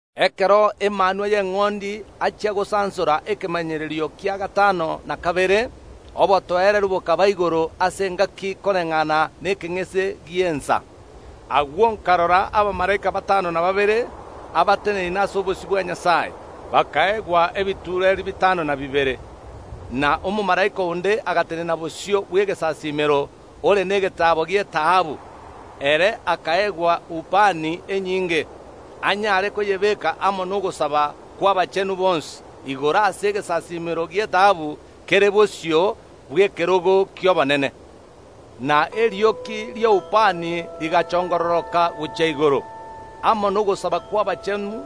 Ekero Emanwa y’Eng’ondi achia gosansora ekemanyererio kia gatano na kabere, obotoereru bokaba igoro ase engaki koreng’ana nekeng’ese gi’ensa. Agwo nkarora abamalaika batano na babere abateneine ase obosio bwa Nyasae, bakaegwa ebitureeri bitano na bibere. Na omomalaika onde agatenena bosio bw’egesasiimero ore negetaabo gi’etaabu; ere akaegwa ubani enyinge, anyare koyebeeka amo nogosaba kw’abachenu bonsi igoro ase egesasiimero gi’etaabu kere bosio bw’ekerogo ki’obonene. Na erioki ria ubani rigachongororoka gochia igoro amo nogosaba kw’abachenu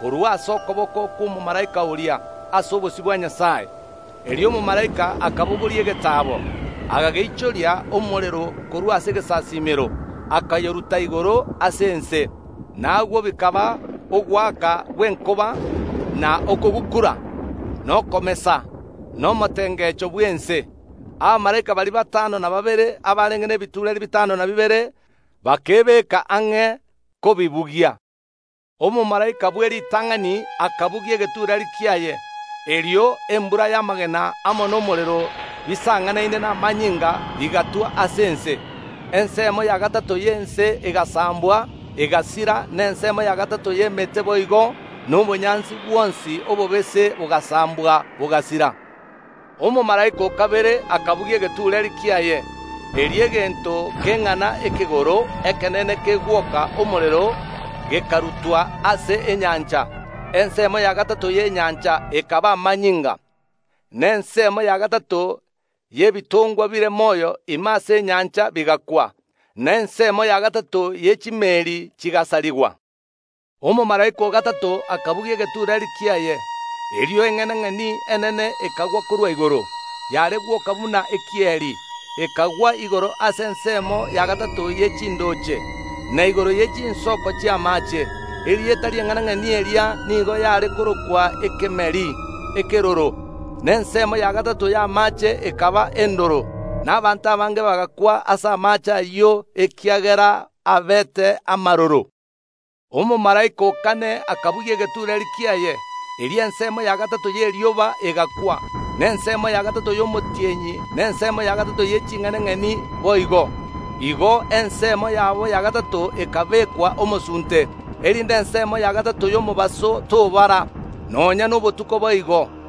korwa ase okoboko kw’omomalaika oria ase obosio bwa Nyasae. Erio omomalaika akabogoria egetaabo, akageichoria omorero korwa ase egesasiimero akayoruta igoro ase ense, na agwo bikaba ogoaka gw’enkoba, na okogukura, na okomesa, na omotengecho bw’ense. Abamalaika baria batano na babere abarenge nebitureri bitano na bibere bakebeka ang’e kobibugia. Omomalaika bw’eritang’ani akabugia egetureeri kiaye. Erio embura y’amagena amo nomorero, bisang’anaine namanyinga, bigatwa ase ense. Ensemo ya gatato y’ense egasambwa egasira, na ensemo ya gatato y’emete boigo, na obonyansi bwonsi obobese bogasambwa, bogasira. Omomalaika o kabere akabugia egetureeri kiaye. Erio egento keng’ana ekegoro ekenene kegwoka omorero gekarutwa ase enyancha. Ensemo ya gatato y’enyancha ekaba amanyinga, na ensemo ya gatato y’ebitongwa bire moyo ime ase enyancha bigakwa, na ensemo ya gatato ye chimeeri chigasarigwa. Omomalaika o gatato akabugia egetureeri kiaye. Erio eng’enang’eni enene ekagwa korwa igoro, yare gwoka buna ekieri; ekagwa igoro ase ensemo ya gatato ye chindooche, na igoro ye chinsoko chi’amaache. Erieta ri’eng’enang’eni eria nigo yare korokwa Ekemeri Ekeroro; na ensemo ya gatato y’amaache ekaba endoro, na abanto abange bagakwa ase amaache ayio, ekiagera abeete amaroro. Omomalaika o kane akabugia egetureeri kiaye. Erio ensemo ya gatato y’erioba egaakwa, na ensemo ya gatato y’omotienyi, na ensemo ya gatato ye ching’enang’eni boigo. Igo ensemo yabo ya gatato ekabekwa omosunte, erinde ensemo ya gatato y’omobaso tobara, nonya nobotuko boigo.